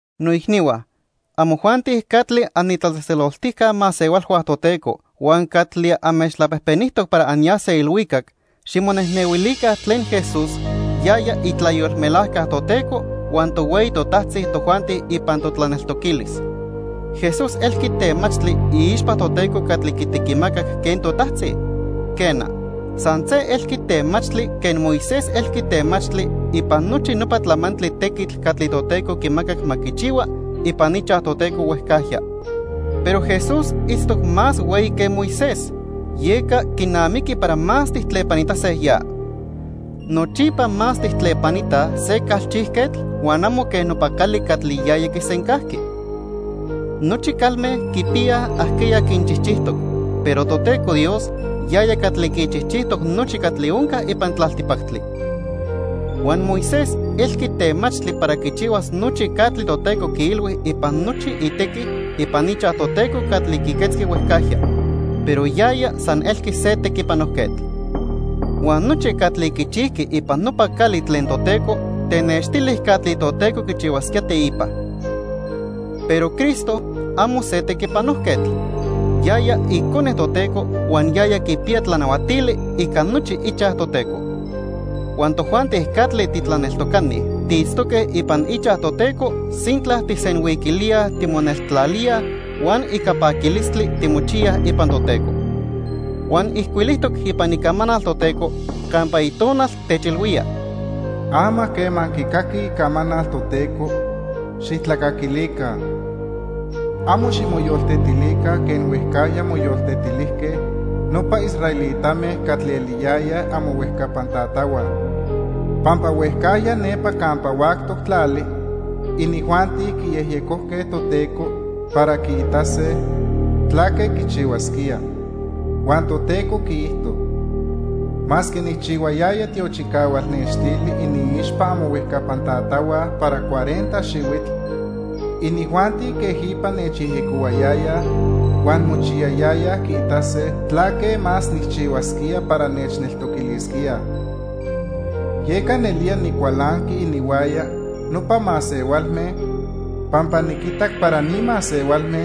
Noicnihua, amojuanti catli anitlatzejtzeloltijca masehualhua Toteco huan catli anmechtlapejpenijtoc para anyase ilhuicac, ximonejnehuilica tlen Jesús, yaya itlayolmelajca Toteco huan tohueyi totajtzi tojuanti ipan totlaneltoquilis. Jesús elqui temachtli iixpa Toteco catli quitequimacac quen totajtzi. Quena, san se elqui temachtli quen Moisés elqui temachtli ipan nochi nopa tlamantli tequitl catli Toteco quimacac ma quichihua ipan ichaj Toteco huejcajya. Pero Jesús itztoc más hueyi que Moisés, yeca quinamiqui para más tijtlepanitase ya. Nochipa más tijtlepanitaj se calchijquetl huan amo quen nopa cali catli yaya quisencajqui. Nochi calme quipiyaj ajqueya quinchijchijtoc, pero Toteco Dios, yaya catli quichijchijtoc nochi catli onca ipan tlaltipactli. Huan Moisés elqui temachtli para quichihuas nochi catli Toteco quiilhui ipan nochi itequi ipan ichaj Toteco catli quiquetzqui huejcajya, pero yaya san elqui se tequipanojquetl. Huan nochi catli quichijqui ipan nopa cali tlen Toteco tenextili catli Toteco quichihuasquía teipa. Pero Cristo, amo se tequipanojquetl, yaya Icone Toteco huan yaya quipiya tlanahuatili ica nochi ichaj Toteco. Huan tojuanti catli titlaneltocani tiitztoque ipan ichaj Toteco sintla tijsenhuiquilíaj timoneltlalíaj huan ica paquilistli timochiyaj ipan Toteco. Huan ijcuilijtoc ipan Icamanal Toteco campa Itonal techilhuía: "Ama quema anquicaquij icamanal Toteco, xijtlacaquilica. Amo ximoyoltetilica quen huejcajya moyoltetilijque nopa israelitame catli eliyayaj amohuejcapan tatahua. Pampa huejcajya nepa campa huactoc tlali inijuanti quiyejyecojque Toteco para quiitase tlaque quichihuasquía." (Huan Toteco quiijto:) "Masque nijchihuayaya tiochicahual nextili iniixpa amohuejcapan tatahua para cuarenta xihuitl, inijuanti quejipa nechyejyecohuayayaj huan mochiyayayaj quiitase tlaque más nijchihuasquía para nechneltoquilisquíaj. Yeca nelía nicualanqui ininhuaya nopa masehualme, pampa niquitac para ni masehualme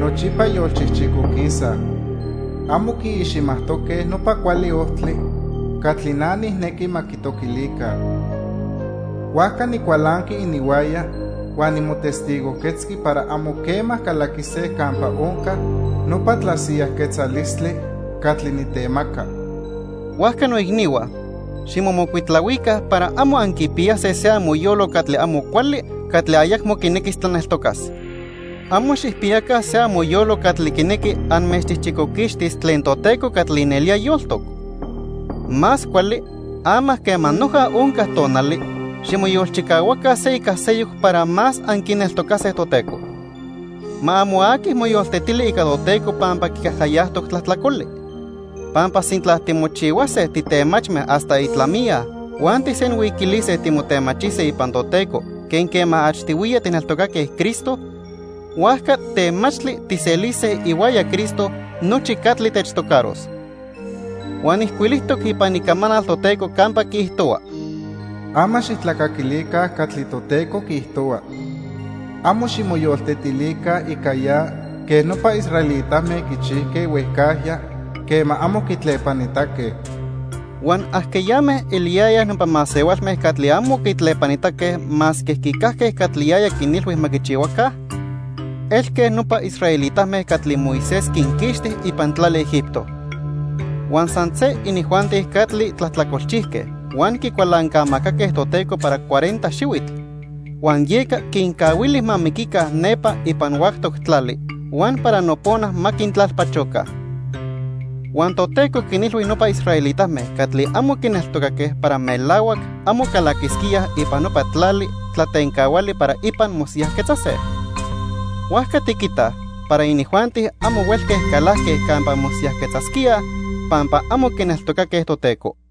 nochipa yolchijchicoquisaj. Amo quiiximajtoque nopa cuali ojtli catli na nijnequi ma quitoquilica. Huajca nicualanqui ininhuaya huan nimotestigojquetzqui para amo quema calaquise campa onca nopa tlasiyajquetzalistli catli nitemaca." Huajca noicnihua, ximomocuitlahuica para amo anquipiyase se amoyolo catli amo cuali catli ayacmo quinequis tlaneltocas. Amo xijpiyaca se amoyolo catli quinequi anmechchijchicoquixtis tlen Toteco catli nelía yoltoc. Más cuali, ama quema noja onca tonali, ximoyolchicahuaca se ica seyoc para más anquineltocase Toteco. Ma amo aqui moyoltetili ica Toteco pampa quicajcayajtoc tlajtlacoli. Pampa sintla timochihuase titemachme hasta itlamiya huan tijsenhuiquilise timotemachise ipan Toteco quen quema achtihuiya tijneltocaque Cristo, huajca temachtli tijselise ihuaya Cristo nochi catli techtocaros. Huan ijcuilijtoc ipan Icamanal Toteco campa quiijtohua: "Ama xijtlacaquilica catli Toteco quiijtohua. Amo ximoyoltetilica ica ya quen nopa israelitame quichijque huejcajya quema amo quitlepanitaque." Huan ¿ajqueyame eliyayaj nopa masehualme catli amo quitlepanitaque masque quicajque catli yaya quinilhui ma quichihuaca? Elque nopa israelitame catli Moisés quinquixti ipan tlali Egipto. Huan san se inijuanti catli tlajtlacolchijque huan quicualancamacaque Toteco para cuarenta xihuitl, huan yeca quincahuili ma miquica nepa ipan huactoc tlali huan para nopona ma quintlalpachoca. Huan Toteco quinilhui nopa israelitame catli amo quineltocaque para melahuac amo calaquisquíaj ipan nopa tlali tlatencahuali para ipan mosiyajquetzase. Huajca tiquitaj para inijuanti amo huelque calajque campa mosiyajquetzasquíaj pampa amo quineltocaque Toteco.